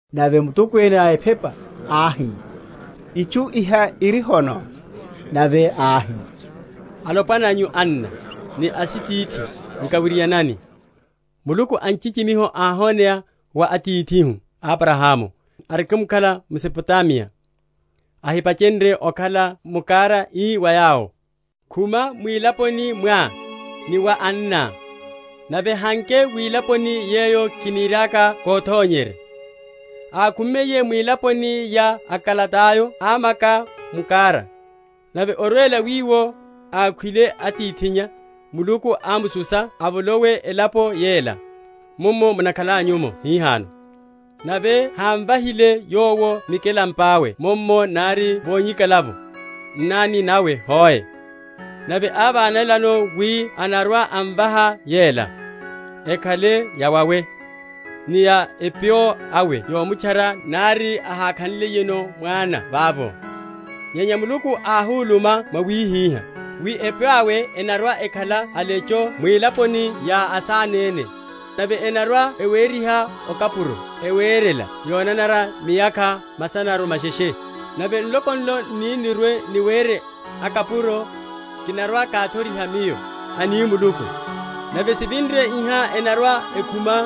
Nave mutokwene a ephepa áhi, Itchu iha iri hono? Nave áhi, Alopwana nyu, anna, ni asitithi, nkawirianani. Muluku a nchichimiho áhoneya wa atithihu Abrahamu, arikimkhala m’Mesopotamiya, ahipachenrye okhala m’Kara; ii wa yowo, Khuma mwilaponi mwá ni wa anná, nave hanke wilaponi yeyo kiniriaka kothonyerye. Ákhummiye mwilaponi ya aKaldayo amaka m’Kara: nave, orwela wiwo, akhwile atithinnya, Muluku ámususa avolowe elapo yela, mummo munakhalanyu’mo hihano: nave hámvahile yowo mikelampa’we mummo, nari vonyikala’vo nnani nawe hoe; nave ávanelano wi anarwa‐amvaha yela: ekhale yawawe, ni ya epyo awe yomutchara, nari áhákha?-?nliyeno mwana vavo. Nyenya Muluku áhuluma mwawihiha, wi epyo awe enarwa‐ekhala alecho mwilaponi ya asanene, nave enarwa‐eweriha okapuro ewerela yonanara miyakha masana masheshe. Nave nloko nlo n’ni‐n’rwe‐niwere akapuro, kinarwa‐kathoriha Miyo, ani Muluku; nave sivinre iha enarwa‐ekhuma,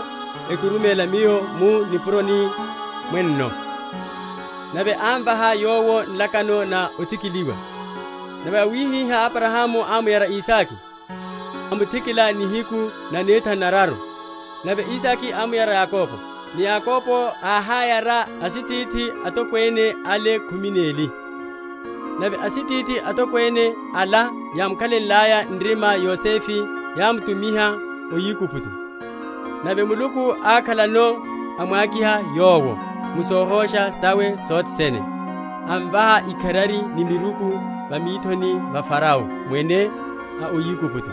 ekiruméla Miyo mu nipuroni mwenno. Nave ámvaha yowo nlakano na othikiliwa: nave wawihiha Abrahamu ámuyara Isake, amuthikila nihiku nanethanu neraru; nave Isake ámuyara Yakobo, ni Yakobo áháyara asitithi atokwene ale khumi neli. Nave asitithi atokwene ala yámukhalenlaya nrima Yosefe yámutumiha o Aigupto; nave Muluku ákhalano, amwakiha yowo mu sohosha sawe sothe sene, amvaha ikharari ni miruku va mithoni va Farao Mwene a o Aigupto;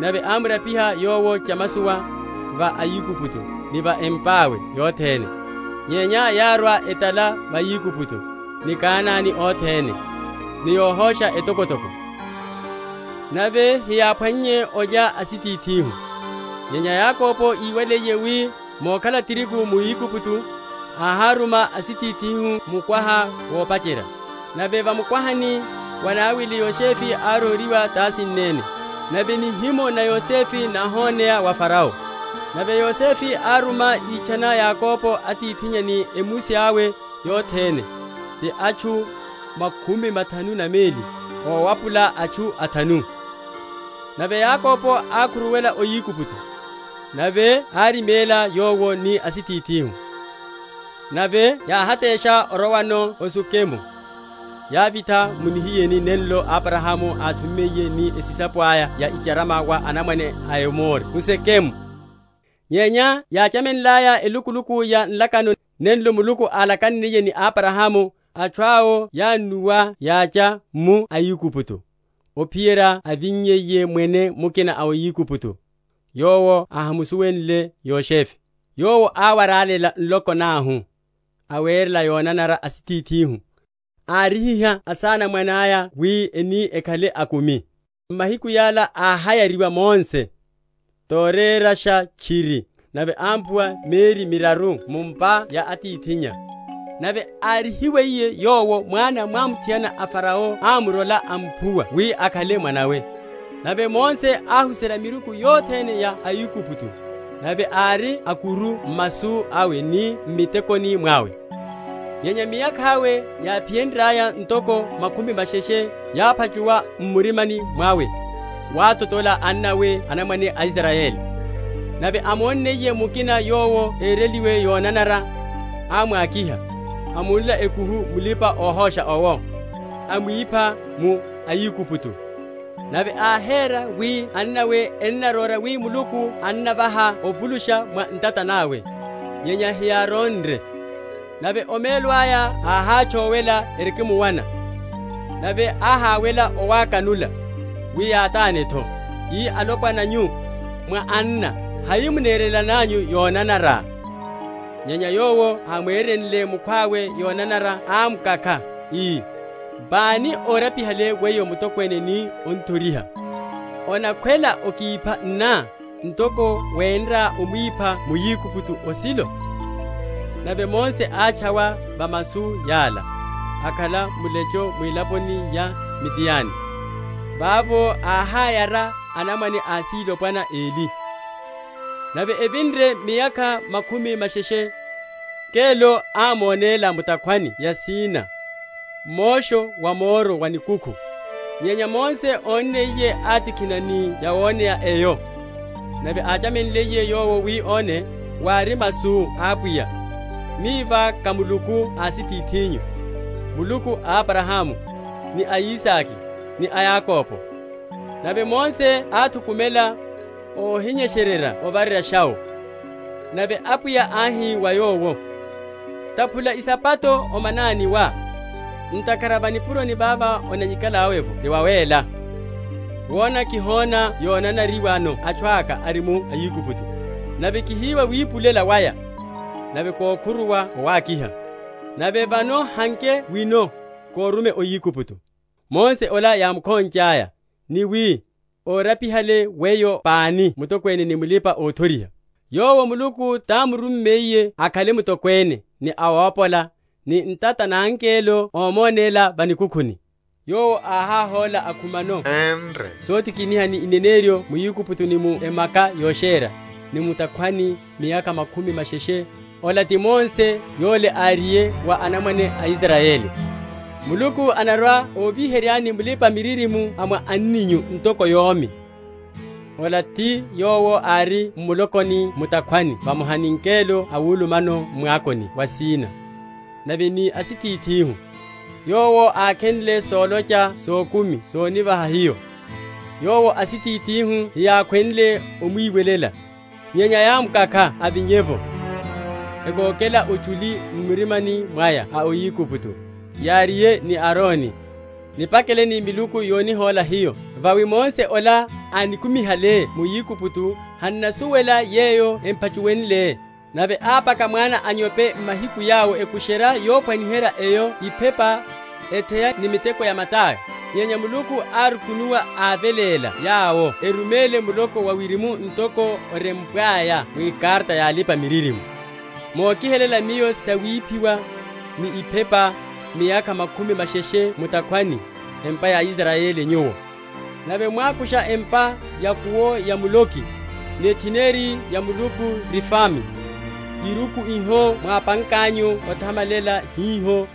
nave ámurapiha yowo chamasowa va Aigupto ni va empa’we yothene. Nyenya yárwa etala va Aigupto, ni Kanane othene, ni yohosha etokotoko: nave hiyáphwannye olya asitithihu. Nyenya Yakobo íwaliye wi mokhala tirigu mu Aigupto, áháruma asitithihu mukwaha wopacherya. Nave va mukwahani wanawili Yosefe ároriwa tasinneni; nave nihimo na Yosefe náhoneya wa Farao. Nave Yosefe áruma, ítchana Yakobo atithinnya, ni a emusi awe yothene, ti atchu makhumi mathanu na meli owapula atchu athanu. Nave Yakobo ákhuruwela o Aigupto; nave áriméla, yowo ni asitithihu; nave yáhátesha orowano o Sukemu, yávitha mu nihiyeni nenlo Abrahamu áthummiye ni esisapo aya ya icharama wa anamwane a Emori m’Sukemu. Nyenya yáchamenlaya elukuluku ya nlakano, nenlo Muluku álakanniye ni Abrahamu, atchu awo yánnuwa yacha mu Aigupto, ophiyerya ávinnyiye mwene mukina va Aigupto, yowo ahámusuwenle Yosefe. Yowo áwaralela nloko nahu, awerela yonanara asitithihu, árihiha asanamwane aya wi eni ekhale akumi. M’mahiku yala áhayariwa Mose, torerasha tchiri; nave ámphuwa mieri miraru mu’mpa ya atithinnya: nave árihiwiye yowo, mwana mwamuthiana a Farao ámurola, amphuwa wi akhale mwana’we. Nave Mose áhuserya miruku yothene ya aAigupto; nave ári a’kuru m’masu awe ni m’mitekoni mwawe. Nyenya miyakha awe yáphiyenryaya ntoko makhumi masheshe, yáphachuwa m’murimani mwawe wathotola annawe anamwane a Israyeli. Nave ámonniye mukina yowo ereliwe yonanara, ámwakiha, amunla ekuhu mulipa‐ohosha owo, amwipha muAigupto. Nave áhera wi annawe enarora wi Muluku anavaha ovulusha mwa ntata nawe; nyenya hiyáronre. Nave omelo aya áhátchowela erikimuwana, nave áháwela owákanula, wi yatane’tho, ii, Alopwana nyu, mwá anna; hai munerelananyu yonanara? nyenya yowo ámwerenle mukhwawe yonanara ámukakha, ii, Pani órapihale weyo mutokwene ni ón’thoriha? Onakhwela okipha nná, ntoko wenrá omwipha muAigupto osilo? Nave Mose átchawa va masu yala, akhala mulecho mwilaponi ya Midiani; vavo áhayara anamwane asilopwana eli. Nave evinre miyakha makhumi masheshe, ngelo ámonéla mu’takhwani ya Sina, m’mosho wa moro wa nikukhu. Nyenya Mose ónniye, átikhina ni yawoneya eyo; nave áchamenliye yowo wi óne, wári masu a Apwiya, Miva ká Muluku a asitithinyu, Muluku a Abrahamu, ni a Isake, ni a Yakobo. Nave Mose áthukumela, óhinyesererya ovareryasha’wo. Nave Apwiya áhi wa yowo, Taphula isapato o manani wá; ntakhara va nipuroni vava onanyikalá’vo ti vawéla. Wona kihona yonanariwano atchu aka ari mu Aigupto, nave kihiwa wipulela waya; nave kókhuruwa owákiha: nave vano, hanke wino, kórume o Aigupto. Mose ola yámukhonchaya, ni wi, Órapihale weyo pani mutokwene ni mulipa‐othoriha? yowo Muluku támurummiye akhale mutokwene, ni awópola, ni ntata na ngelo ómonéla va nikukhuni. Yowo áháhóla, akhumano énre sotikiniha ni ineneryo mu Aigupto, ni mu Emaka yosherya, ni mu’takhwani miyakha makhumi masheshe. Ola ti Mose yole, áriye wa anamwane a Israyeli, Muluku anarwa‐oviheryani Mulipa‐miririmo a mwa anninyu, ntoko yómi. Ola ti yowo ári m’mulokoni mu’takhwani vamoha ni ngelo awulumano m’mwakoni wa Sina, nave ni asitithihu: yowo ákhenle solocha sokumi sonivaha hiyo: yowo asitithihu hiyákhwenle omwiwelela, nyenya yámukakha avinye’vo, ekokela ochuli m’murimani mwaya o Aigupto, yáriye ni Arone, Nipakeleni miluku yonihóla hiyo: vawi Mose ola, anikumihale mu Aigupto, han’nasuwela yeyo empha?-?chuwenle. Nave ápaka mwana a’nyope mahiku yawo, ekusherya yophwaniherya eyo iphepa, etheya ni miteko ya mata aya. Nyenya Muluku árukunuwa, áveléla yawo eruméle muloko wa wirimu; ntoko orempwaya mwikarata ya alipa‐miririmo. Mokihelela Miyo sawiphiwa, ni iphepa, Miyakha makhumi masheshe mu’takhwani, empa ya Israyeli nyuwo? Nave mwákusha empa ya’kuwo ya Moloki, Ni etheneri ya Muluku Refami, Iruku iho mwápankanyu othamalela hiho: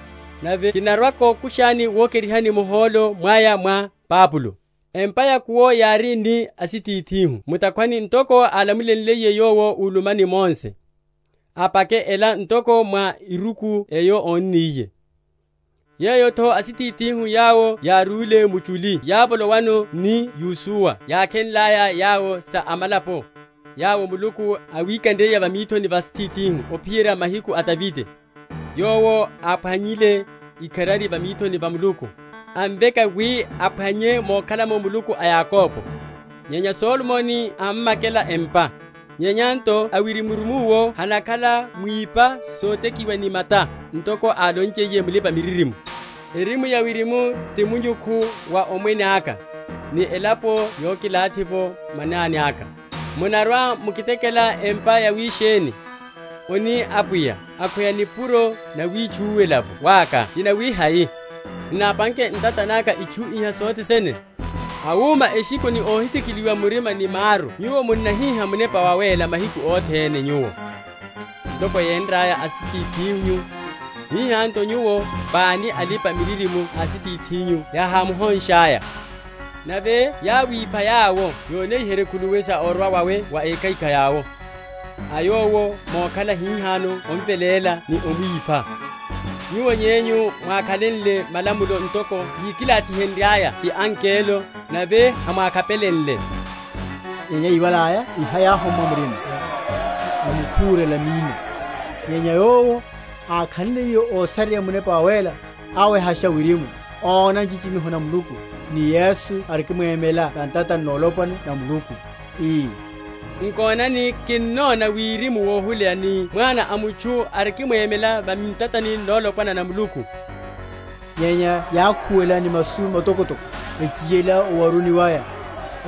Nave kinarwa‐kokushani wokerihani muhólo mwaya mwa Babulo. Empa ya’kuwo yári ni asitithihu mu’takhwani, ntoko álamulenliye Yowo úluma ni Mose, apake ela ntoko mwa eruku eyo ónniye. Yeyo’tho asitithihu yawo yárúle muchuli yávolowano ni Yosua yákhenlaya yawo sa amalapo, yawo Muluku áwikanriye va mithoni va asitithihu, ophiyerya mahiku a Davide; yowo áphwannye ikharari va mithoni va Muluku, amveka wi aphwanye mokhalamo Muluku a Yakobo. Nyenya Solomoni ámmakela empa. Nyenya nto Awirimurimu owo hanakhala mwipa sotekiwa ni mata; ntoko álonchiye mulipa‐miririmo, Erimu ya wirimu ti munyukhu wa omwene aka, Ni elapo yokilathi’vo manani aka; Munarwa‐mukitekela empa yawisheni? oni Apwiya: Akhweya nipuro nawítchúwela’vo waka ti nawihai? Hinápanke ntata naka itchu iha sothe sene? Awuma eshikho ni óhithikiliwa murima ni maru nyuwo, munnahíha Munepa Wawéla mahiku othene nyuwo: ntoko yénraya asitithinyu, hiha’tho nyuwo. Pani a alipa‐miririmo asitithinyu yahámuhonshaya? nave yáwipha yawo yonihenrye khuluwi sa orwa wawe wa Ékhaikhai owo; a Yowo mokhala hihano ómveléla ni ómwipha; nyuwo yenyu mwákhenle malamulo ntoko yákilathiheryiwaya ti angelo, nave hamwákhapelenle. Nyenya yíwalaya iha yáhommwa murima, emukhúrela minno. Nyenya yowo, ákhanliye ósareya Munepa Wawéla, áwehasha wirimu, óna nchichimiho na Muluku, ni Yesu arikimwemela va ntatani nolopwana na Muluku, ii, Nkonani, kinnona wirimu wohuleya, ni Mwana a mutchu arikimwemela va ntatani nolopwana na Muluku. Nyenya yákhuwela ni masu matokotoko, echiyela owaruni waya,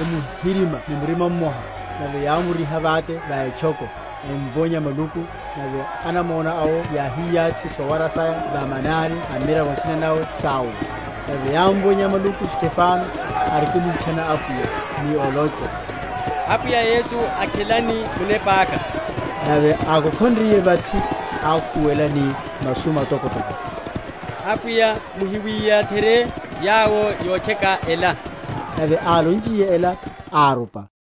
emuhi?-?rimya ni murima mmoha; nave yámuriha vate va etchoko, emvonya maluku; nave anamona awo yáhiyathi sowara saya va manani a mmiravo nsina nawe Saulo. Nave yámvonya maluku Stefano, arikimwitchana Apwiya, ni olocha, Apwiya Yesu, akhelani munepa aka. Nave ákokhonriye vathi, ákhuwela ni masu matokotoko, Apwiya muhiwiyatherye yawo yotcheka ela. Nave álonchiye ela, árupa.